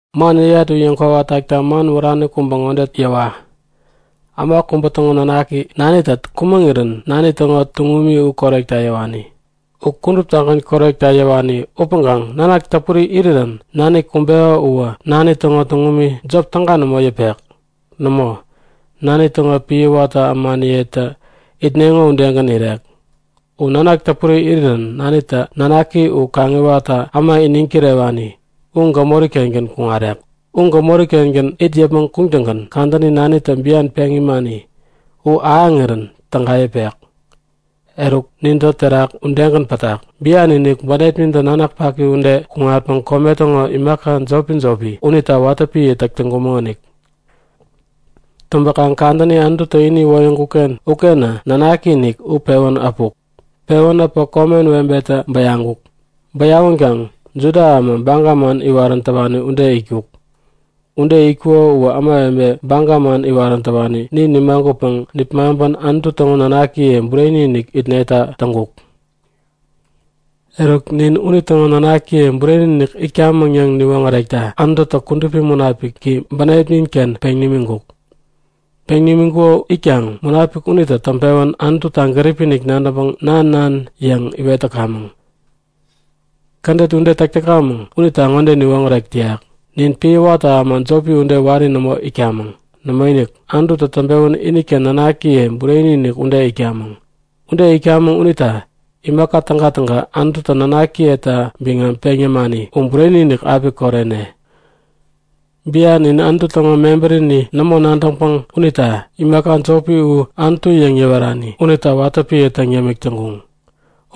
Man yäyat u yäŋkwawa takta man wärani kubä ŋode yäwa; Äma kubä täŋo nanaki, nanitä kumäŋirän nani täŋo tuŋumi u korewekta yäwani. U kuduptagän korewekta yäwani upäŋkaŋ nanak täpuri irirän nani kumbeko uwä nani täŋo tuŋum jop täga nämo yäpek. Nämo, nani täŋo piä watä ämaniyetä itneŋo udegän irek. U nanak täpuri irirän nanitä nanaki u kaŋiwatta äma iniŋ kirewani u gämori-kengän kuŋarek. U gämori-kengän it yäpmäŋ kuŋtäŋgän kadäni nanitä bian peŋ imani u ahäŋirän täga yäpek. Eruk, nintä terak udegän pätak. Bian-inik bänepnintä nanak paki ude kuŋatpäŋ kome täŋo imaka jopi-jopi unita watä piä täk täŋkumäŋonik. Täŋpäkaŋ kadäni Anututä ini iwoyäŋkuk-ken ukenä nanaki-inik u pewän äpuk. Pewän äpä komen webe kubätä bäyaŋkuk. Bäyawänkaŋ Juda äma, baga man iwarän täwani ude itkuk. Ude itkuko uwä ämawebe baga man iwarän täwani nin nimagutpäŋ nipmaŋpän Anutu täŋo nanakiye bureni-inik itneta täŋkuk. Eruk, nin unitäŋo nanakiye bureni-inik itkamäŋ yäŋ niwoŋärekta Anututä Kudupi Munapiki bänepnin-ken peŋ nimiŋkuk. Peŋ nimiŋkuko itkaŋ Munapik unitä täŋpewän Anututa gäripi-inik nadäŋpäŋ Nan! Nan! yäŋ iwet täkamäŋ. Kädet ude täk täkamäŋ unitä ŋode niwoŋärek täyak; Nin piä watä äma jopi ude wari nämo itkamäŋ. Nämoinik! Anututä täŋpewän iniken nanakiye bureni-inik ude itkamäŋ. Ude itkamäŋ unita imaka tägatäga Anututä nanakiyeta biŋam peŋ yämani u bureni-inik api korene. Bian in Anutu täŋo mebärini nämo nadäŋpäŋ unita imaka jopi u anutu yäŋ yäwerani unita watä piä täŋ yämik täŋkuŋ.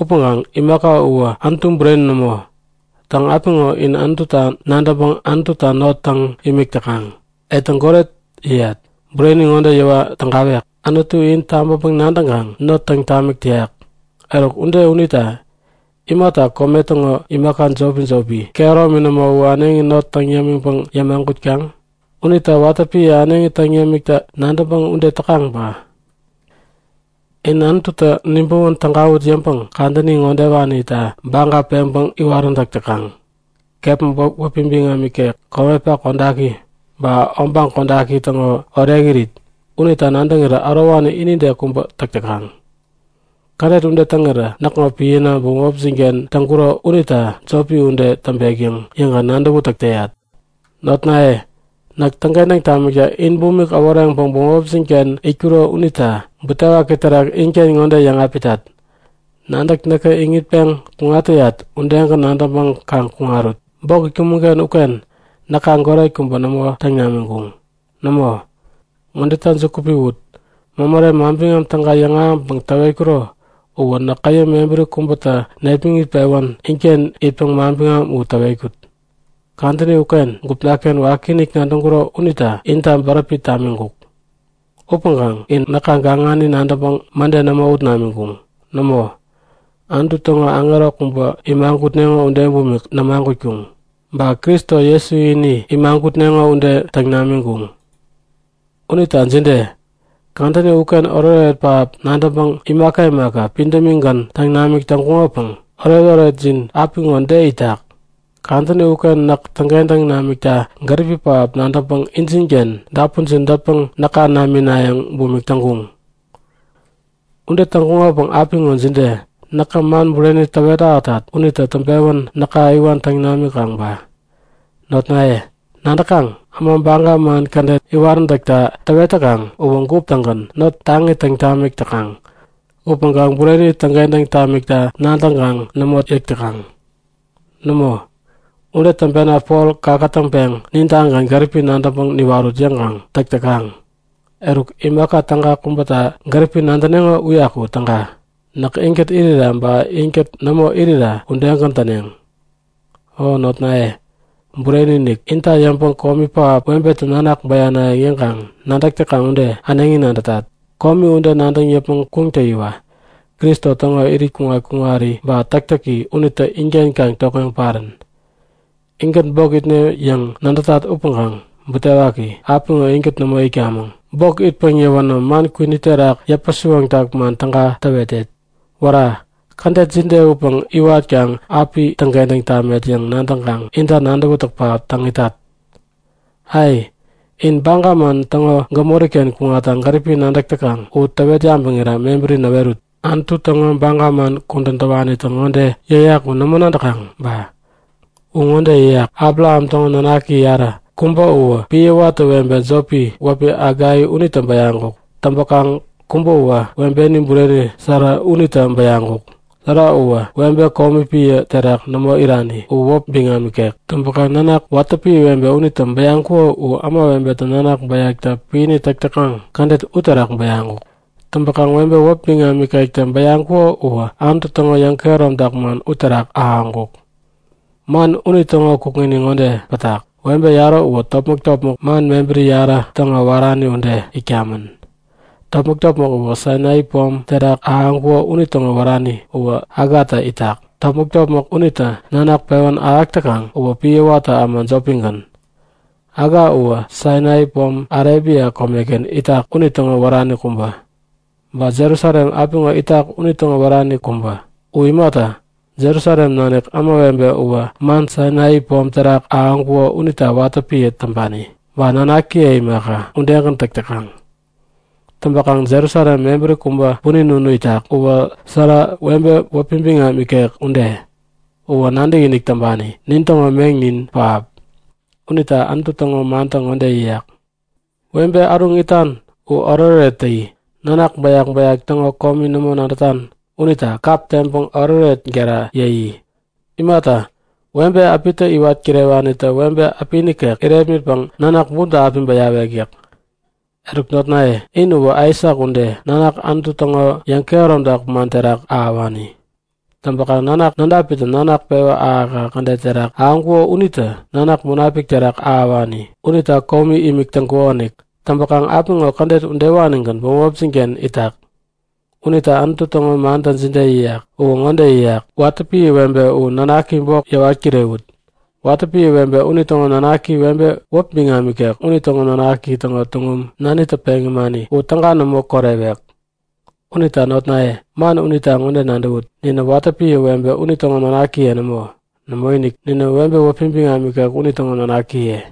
Upäŋkaŋ imaka uwä Anutu bureni nämo. Täŋ, apiŋo in Anututa nadäŋpäŋ Anututa not täŋ imik täkaŋ. Etäŋ goret yäyat. Bureni ŋode yäwa tägawek; Anutu in tabäŋpäŋ nadäŋkaŋ not täŋ tamik täyak. Eruk ude unita imata kome täŋo imaka jopi-jopi, kehäromini nämo u äneŋi not täŋ yämiŋpäŋ yämagutkaŋ? Unita watä piä äneŋi täŋ yämikta nadäŋpäŋ ude täkaŋ ba? In Anututä nibäwän tägawut yäŋpäŋ kadäni ŋodewanita baga peŋpäŋ iwaräntäk täkaŋ; Kepma wäpi biŋam ikek, komepak kodaki ba obaŋ kodaki täŋo orekirit unita nadäŋirä ärowani inide kubä täk täkaŋ. Kädet ude täŋirä näkŋo piäna bämopjin-ken täŋkuro unitä jopi ude täŋpek yäŋ yäŋkaŋ nadäwätäk täk täyat. Notnaye, näk täŋkentäŋ tamikta in bumik äworeŋpäŋ bämopjin-ken itkuro unita butewaki terak inken ŋode yäŋapitat; Nadäk näkä iŋitpeŋ kuŋat täyat udegän nadäŋpäŋ kaŋ kuŋarut. Bok itkumäŋ-ken uken näka goret kubä nämo täŋ namiŋkuŋ. Nämo! Ŋodeta juku piwut; Mämärem Manbiŋam Täga yäŋahäŋpäŋ täwetkuro uwä näk käyäm mebäri kubätä nepmäŋit-pewän inken itpäŋ manbiŋam u täwetkut. Kadäni ugän gupna-ken wakiinik nadäŋkuro unitä inta bäräpi tamiŋkuk. Upäŋkaŋ in näka gaŋani nadäŋpäŋ mäde nämo ut namiŋkuŋ. Nämo, Anutu täŋo aŋero kubä imagutneŋo ude bumik nämagutkuŋ. Ba Kristo Jesu ini imagutneŋo ude täŋ namiŋkuŋ. Unita jide? Kadäni uken oretoret pähap nadäŋpäŋ imaka imaka pidämigän täŋ namik täŋkuŋopäŋ oretoretjin u apiŋo de itak? Kadäni uken näk täŋkentäŋ namikta gäripi pähap nadäŋpäŋ injinken dapunjin dätpäŋ näka naminayäŋ bumik täŋkuŋ. Ude täŋkuŋopäŋ apiŋo jide? Näkä man bureni täwet ahätat unitä täŋpewän näka iwan täŋ namikaŋ ba? Notnaye, nadäkaŋ? Äma baga man kädet iwaräntäkta täwet täkaŋ uwä gup-tägän not taŋi täŋ tamik täkaŋ upäŋkaŋ bureni täŋkentäŋ tamikta nadäŋkaŋ nämo yäk täkaŋ. Nämo, ude täŋpena Pol kakätäŋpeŋ nintagän gäripi nadäŋpäŋ niwarut yäŋkaŋ täk täkaŋ. Eruk, imaka täga kubäta gäripi nadäneŋo uyaku täga. Näk inkät irira ba inkät nämo irira udegän täneŋ. O nanaknaye bureni-inik, inta yäŋpäŋ komi pähap, webetä nanak bäyanayäŋ yäŋkaŋ nadäk täkaŋ ude äneŋi nadätat. Komi ude nadäŋ yäpmäŋ kuŋtäyiwa Kristo täŋo irit kuŋat-kuŋari ba täktäki unitä inken kaŋ tokŋeŋ parän. Inkät bok itne yäŋ nadätat upäŋkaŋ butewaki, apiŋo inkät nämo itkamäŋ. Bok itpäŋ yäwänä man kwini terak yäpä-siwoŋtak man täga täwetet. Wära! Kädet jide upäŋ iwatkaŋ api täŋkentäŋ tamet yäŋ nadäŋkaŋ inta nadäwätäk pähap täŋ itat! Ai, in baga man täŋo gämori-ken kuŋatta gäripi nadäk täkaŋ u täwet yabäŋira mebäri näwerut; Anutu täŋo baga man kudän täwanitä ŋode yäyak u nämo nadäkaŋ ba? U ŋode yäyak; Abraham täŋo nanaki yarä. Kubä uwä piä watä webe jopi wäpi Haga unitä bäyaŋkuk. Täŋpäkaŋ kubäwä webeni bureni Sara unitä bäyaŋkuk. Sara uwä webe komi piä terak nämo irani u wäp biŋam ikek. Täŋpäŋ nanak watä piä webe unitä bäyaŋkuko u ämawebetä nanak bäyakta piäni täk täkaŋ kädet uterak bäyaŋkuk. Täŋpäkaŋ webe wäp biŋam ikektä bäyaŋkuko uwä Anutu täŋo yäŋkehäromtak man uterak ahäŋkuk. Man unitäŋo kukŋini ŋode pätak; Webe yarä uwä topmäk-topmäk man mebäri yarä täŋo wärani ude itkamän. Topmäk-topmäk kubä Sainai pom terak ahäŋkuko unitäŋo wärani uwä Hagatä itak. Topmäk-topmäk unitä nanak pewän ahäk täkaŋ uwä piä watä äma jopigän. Haga uwä Sainai pom Arebia komeken itak unitäŋo wärani kubä. Ba Jerusalem apiŋo itak unitäŋo wärani kubä. U imata, Jerusalem nanik ämawebe uwä man Sainai pom terak ahäŋkuko unita watä piä täŋpani, ba nanakiye imaka, udegän täk täkaŋ. Täŋpäkaŋ Jerusalem mebäri kubä punin unu itak. Uwä Sara, webe wäpi biŋam ikek ude. Uwä nadäkinik täŋpani nin täŋo meŋnin pähap. Unita Anutu täŋo mantä ŋode yäyak; Webe äruŋ itan u oretoret täyi! Nanak bäyak-bäyak täŋo komi nämo nadätan unita kap teŋpäŋ oretoret gera yäyi! Imata, webe äpitä iwat kirewanitä webe äpi nikek irepmitpäŋ nanak bumta api bäyawek yäk. Eruk notnaye, in uwä Aisak ude, nanak Anutu täŋo yäŋkehäromtak man terak ahäwani. Täŋpäkaŋ nanak nädapitä nanak pewä ahäk-ahäk kädet terak ahäŋkuko unitä nanak Munapik terak ahäwani unita komi imik täŋkukonik. Täŋpäkaŋ apiŋo kädet udewanigän bämopjin-ken itak. Unita Anutu täŋo mantä jide yäyak? U ŋode yäyak; Watä piä webe u nanaki bok yäwat kirewut! Watä piä webe unitäŋo nanaktä webe wäp biŋam ikek unitäŋo nanak täŋo tuŋum, nanitä peŋ imani u täga nämo korewek. Unita notnaye, man unita ŋode nadäwut; Ninä watä piä webe unitäŋo nanakiye nämo. Nämoinik, ninä webe wäpi biŋam ikek unitäŋo nanakiye.